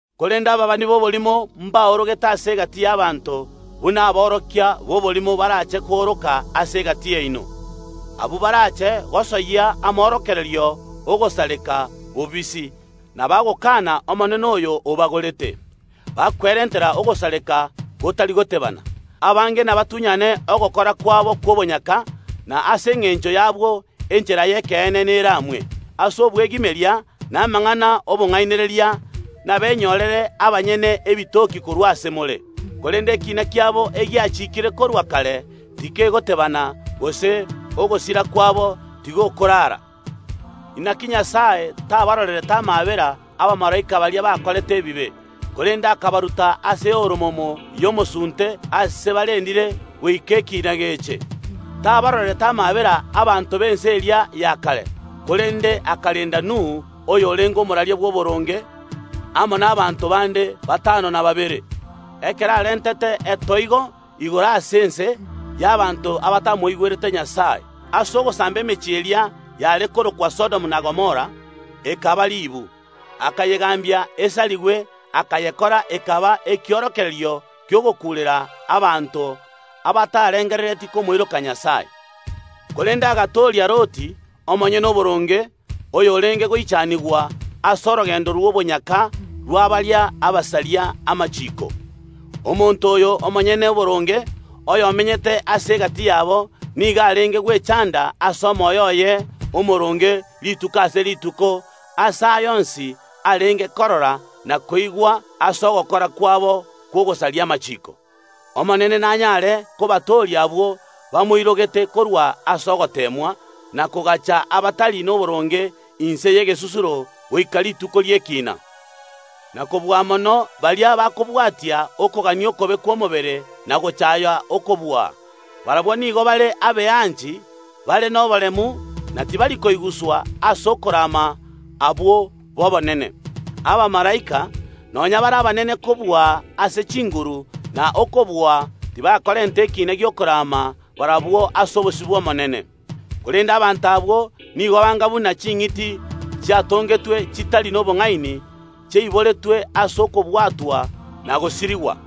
Korende ababani b’oborimo mbaorogete ase egati y’abanto, buna aborokia b’oborimo barache kooroka ase egati yaino. Abwo barache gosoyia amorokererio ogosareka bobisi, na bagokana Omonene oyo obagorete, bakwerentera ogosareka gotari goteebana. Abange nabatunyane ogokora kwabo kw’obonyaka, na ase engencho y’abwo enchera y’ekeene neramwe. Ase obwegimeria na amang’ana ’obong’ainereria nabenyorere abanyene ebitoki korwa ase more. Korende ekiina kiabo, egiachikiire korwa kare, tikegoteebana, gose ogosira kwabo tigokorara. Naki Nyasae tabarorerete amaabera abamalaika baria bakorete ebibe, korende akabaruta ase omorero o kare na kare aase barendire goika ekiina geche. Tabarorerete amaabera abanto ab’ense eria ya kare, korende akarenda Nuhu, oyorenge omoraria bw’oboronge, amo nabaanto bande batano na babere, ekero arentete etoigo igoro ase ense y’abanto abatamoirogete Nyasae. Ase ogosamba emechie eria yare korokwa Sodomu na Gomora ekaba ribu, akayegambia esarigwe, akayekora ekaba ekiorokererio ki’ogokuurera abanto abatarengereretie komoiroka Nyasae. Korende agatooria Loti, omonyene oboronge, oyorenge goichanigwa ase orogendo rw’obonyaka rwa baria abasaria amachiiko. Omonto oyo omonyene oboronge, oyomenyete ase egati yabo, nigo arenge gwechanda ase omoyo oye omooronge rituko ase rituko ase aya onsi arenge korora na koigwa ase ogokora kwabo kw’ogosaria amachiiko. Omonene nanyare kobatooria abwo bamoirogete korwa ase ogoteemwa, na kogaacha abatari noboronge inse y’egesusuro goika rituko ri’ekiina, na kobua mono baria bakobwatia okogania okobe kw’omobere na gochaaya okobua. Barabwo nigo bare abeanchi, bare noboremu, na tibari koiguswa ase okorama abwo b’obonene. Abamalaika, nonya bare abanene kobua ase chinguru na okobua, tibakorenta ekiina gi’okorama barabwo ase obosio bw’Omonene. Korende abanto abwo nigo banga buna ching’iti chiatongetwe chitari nobong’aini, chiaiboretwe ase okobwatwa na gosirigwa.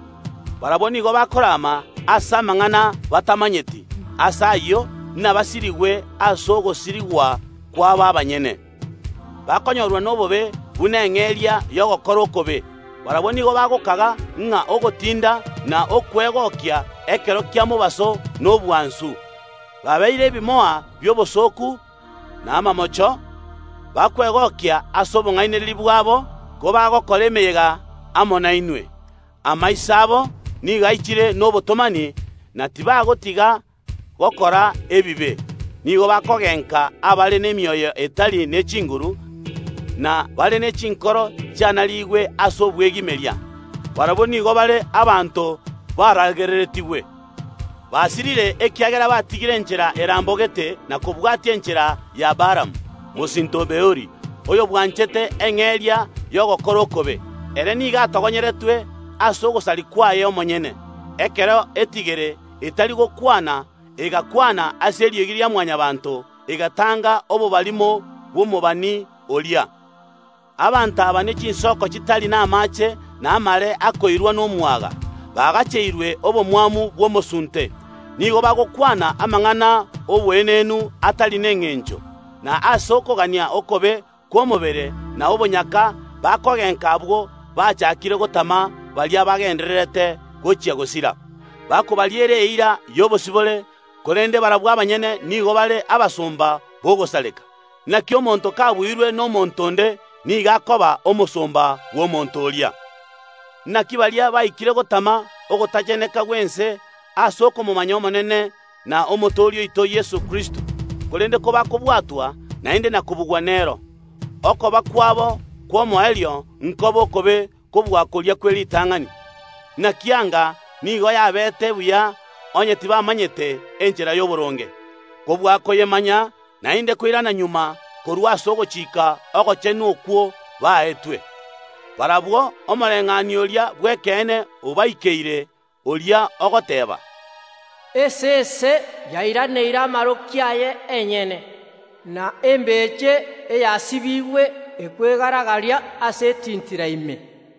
Barabwo nigo bakorama ase amang’ana batamanyeti. Ase ayio inabasirigwe ase ogosirigwa kwabo abanyene. Bakonyorwa nobobe buna eng’eria y’ogokora okobe. Barabwo nigo bagokaga ng’a ogotinda na okwegokia ekero kia mobaso nobwansu. Babeire ebimoa bi’obosooku na amamocho, bakwegokia ase obong’ainereria bwabo kobagokora emeyega amo nainwe. Amaiso abo nigo aichire nobotomani, na tibagotiga gokora ebibe. Nigo bakogenka abare nemioyo etari ne chinguru, na bare ne chinkoro chianarigwe ase obwegimeria. Barabwo nigo bare abanto baragereretigwe. Basirire ekiagera batigire enchera erambogete na kobwatia enchera ya Baalamu, mosinto o Beori, oyobwanchete eng’eria y’ogokora okobe. Ere nigo atogonyeretwe ase ogosaria kwaye omonyene, ekero etigere etari gokwana egakwana ase eriogi ria Mwanyabaanto, egatanga obobarimo bw’omobani oria. Abanto aba nechinsoko chitari namaache na amare akoirwa nomwaga, bagacheirwe obomwamu bw’omosunte. Nigo bagokwana amang’ana oboenenu atari nengencho, na ase okogania okobe kw’omobere na obonyaka bakogenka abwo bachakire gotama baria bagendererete gochia gosira. Bakobariera eira y’obosibore, korende barabwo abanyene nigo bare abasomba b’ogosareka. Naki omonto kabuirwe nomonto onde nigo akoba omosomba bw’omonto oria. Naki baria baikire gotama ogotacheneka gw’ense ase okomomanya Omonene na Omotooria oito Yeso Kristo, korende kobakobwatwa naende na kobugwa nero, okoba kwabo kw’omoerio nkobe okobe kobua koria kw’eritang’ani. Naki anga nigo yabeete buya onye tibamanyete enchera y’oboronge, kobua koyemanya naende koirana magega korwa ase ogochika ogochenu okwo baetwe. Barabwo omoreng’anio oria bw’ekeene obaikeire, oria ogoteeba, “Esese yairaneire amaroki aye enyene,” na “Embeche eyasibigwe ekwegara‐garia ase etintira ime.”